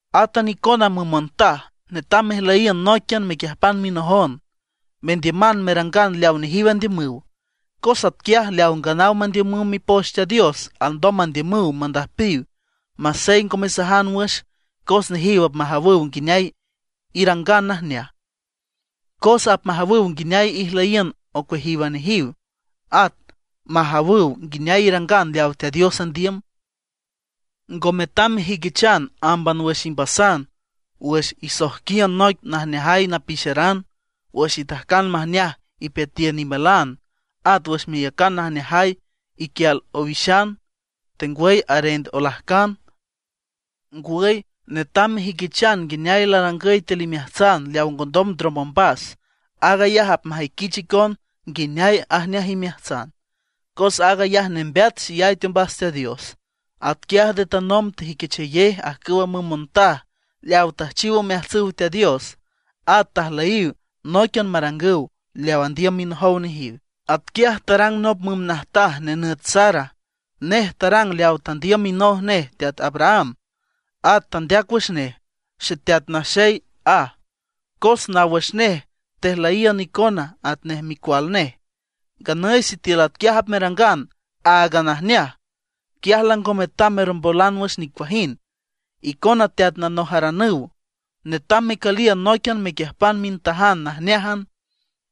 Átan icona müm montaj, netam mejlüyiün nóiquian mequiüjpan minojon, mendiüman merangan leaw nejiw andiümüw. Cos atquiaj leaw nganaw mandiümüw Mipoch Teat Dios alndom mandiümüw mandüjpiw masey ngo mesajan wüx, cos nejiw apmajawüw nguineay irangan najneaj. Cos apmajawüw nguineay ijlüyiün ocueajíwan nejiw, at majawüw nguineay irangan leaw Teat Dios andiüm. Ngo metam mejüiquichan ámban wüx imbasan wüx isojquiün noic najneajay napixeran, wüx itajcan majneaj ipeatiün imalan, at wüx meyacan najneajay iquial owixan, tengwüy arend olajcan. Ngwüy netam mejüiquichan nguineay larangüy tiül imeajtsan leawa ngondom ndrom ombas; aag ayaj apmajüiquich icon nguineay ajneaj imeajtsan, cos aag ayaj nembeat xeyay teombas Teat Dios. Atquiaj nde tanomb tejüiquichayej ajcüwa müm montaj leaw tüjchiw omeajtsüw Teat Dios; at tajlüyiw nóiquian marangüw leaw andiümüw minojow nejiw. Atquiaj tarang nop müm najtaj nenüt Sara, nej tarang leaw tandiüm minoj nej teat Abraham, at tandeac wüx nej, “xeteat naxey”, aj. Cos naw wüx nej tejlüyiün icona atnej micual nej. Nganüy sitiül atquiaj apmerangan áagan najneaj, quiaj lango metam mermbolan wüx nicuajind. Icona teat nanojaranüw, netam mecüliün nóiquian mequiüjpan mintajan najneájan.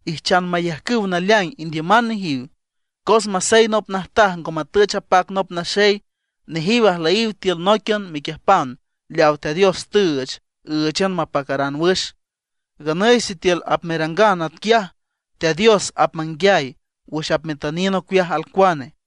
Ijchan mayajcüw naleaing indiüman nejiw, cos masey nop najtaj ngo matüch apac nop naxey, nejiw ajlüyiw tiül nóiquian mequiüjpan leaw Teat Dios tüüch ǘüchan mapacaran wüx. Nganüy sitiül apmerangan atquiaj, Teat Dios apmanguiay wüx apmetüniün ocueaj alcuane.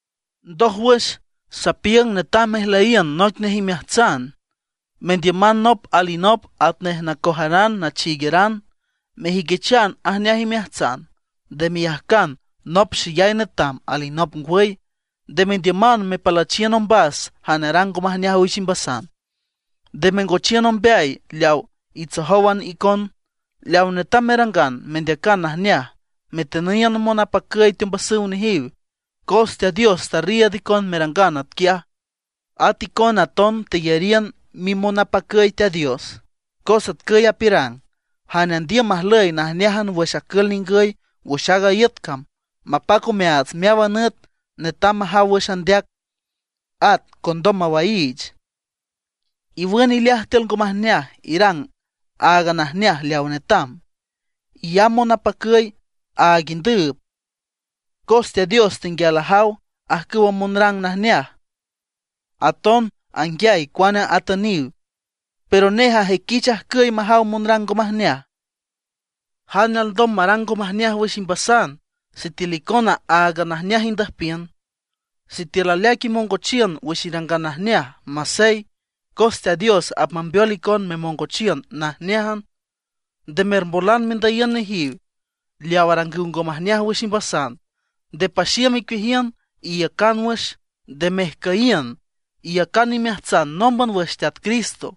Ndójwüx, sapiüng netam mejlüyiün noic nej imeajtsan, mendiüman nop alinop atnej nacojaran nachiigueran, mejüiquichan ajneaj imeajtsan. Nde meyajcan nop xeyay netam, alinop ngwüy. Nde mendiüman mepalüchiün ombas jane arang ngo majneaj wüx imbasan; nde mengochiün ombeay leaw itsojówan icon. Leaw netam merangan, mendeacan najneaj, metüniün monapacüy teombasüw nejiw; cos Teat Dios tarriiüd icon merangan atquiaj, at icona aton teyariün mimonapacüy Teat Dios. Cos atcüy apiürang: Jane andiüm majlüy najneájan wüx acül ningüy wüx aaga iüt cam, mapac omeaats meáwan nüt, netam majaw wüx andeac, at ngondom mawaiich. Iwün ileaj tiül ngo majneaj, irang aaga najneaj leaw netam, iyamb monapacüy, áag indüüb. Cos Teat Dios tenguial ajaw ajcüwa monrang najneaj, aton anguiay cuane atüniw; pero nej ajüiquich ajcüy majaw monrang ngo majneaj. ¿Jane alndom marang ngo majneaj wüx imbasan sitiül icona áagan najneaj indüjpiün? Sitiül aleaic imongochiün wüx irangan najneaj, masey, cos Teat Dios apmambeol icon memongochiün najneájan. Nde mermbolan mendüyiün nejiw leaw arangüw ngo majneaj wüx imbasan; nde paxiüm icueajiün, iiücan wüx, nde mejcüyiün. Iyacan imeajtsan nómban wüx Teat Cristo.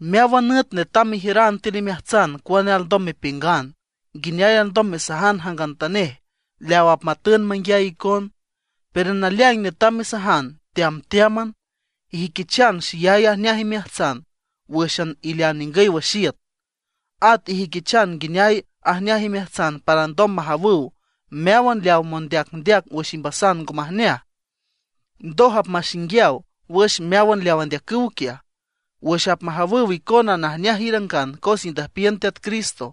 Meáwan nüt netam mejiüran tiül imeajtsan cuane alndom mepiüngan, nguineay alndom mesajan jangantanej leaw apmatün manguiay icon. Pero naleaing netam mesajan teamteáman, ijüiquichan xeyay ajneaj imeajtsan wǘxan ilean ningüy wüx iüt. At ijüiquichan nguineay ajneaj imeajtsan para alndom majawüw meáwan leaw mondeacndeac wüx imbasan ngo majneaj. Ndoj apmaxinguiaw wüx meáwan leaw andeacüw quiaj, wüx apmajawüw icona najneaj irangan cos indüjpiün Teat Cristo.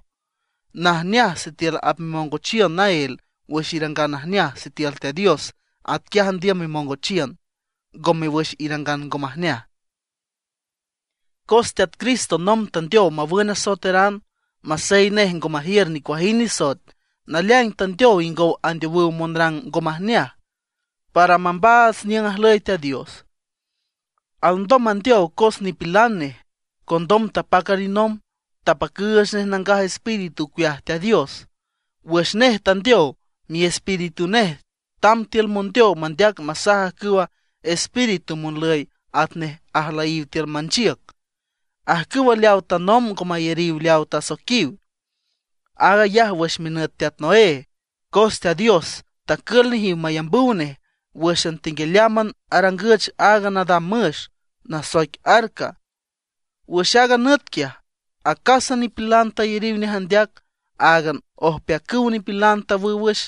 Najneaj sitiül apmemongochiün naél wüx irangan najneaj sitiül Teat Dios atquiaj andiüm memongochiün, ngome wüx irangan ngo majneaj. Cos Teat Cristo nomb tandeow mawün asoeteran; masey nej ngo majiür nicuajind nisoet, naleaing tandeow ingow andeowüw monrang ngo majneaj, para mambaats niüng ajlüy Teat Dios. Alndom mandeow cos nipilan nej, condom tapac alinomb, apacüüch nej Nangaj Espíritu ocueaj Teat Dios. Wüx nej tandeow, miespíritu nej tamb tiül mondeow mandeac masaj ajcüw espíritu monlüy atnej ajlüyiw tiül manchiüc, ajcüwa leawa tanomb ngo mayariw leaw tasoiquiw. Aag ayaj wüx minüt teat Noé, cos Teat Dios tacül nejiw mayambüw nej wǘxan tenguialeámban arangüch aaga nadam müx, nasoic arca. Wüx aaga nüt quiaj acásan nipilan tayariw nej andeac; áagan ojpeacüw nipilan tawüw wüx,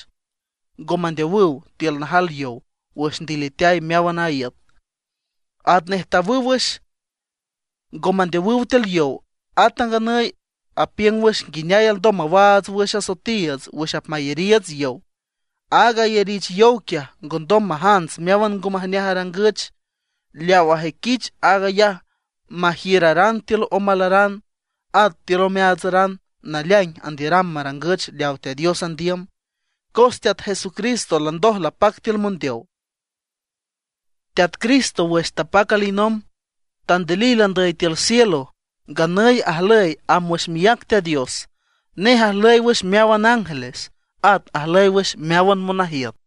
ngo mandeowüw tiül najal yow wüx ndiliteay meáwan a iüt. Atnej tawüw wüx, ngo mandeowüw tiül yow, ata nganüy apiüng wüx nguineay alndom mawaats wüx asoetiiüts wüx apmayariiüts yow. Aaga ayarich yow quiaj ngondom majants meáwan ngo majneaj arangüch. Leawa ajüiquich aag ayaj majiüraran tiül omalaran at tiül omeaatsaran naleaing andiüram marangüch leaw Teat Dios andiüm, cos Teat Jesucristo landoj lapac tiül mondeow. Teat Cristo wüx tapac alinomb, tandilil andüy tiül cielo. Nganüy ajlüy amb wüx miác Teat Dios. Nej ajlüy wüx meáwan ángeles, at ajlüy wüx meáwan monajiüt.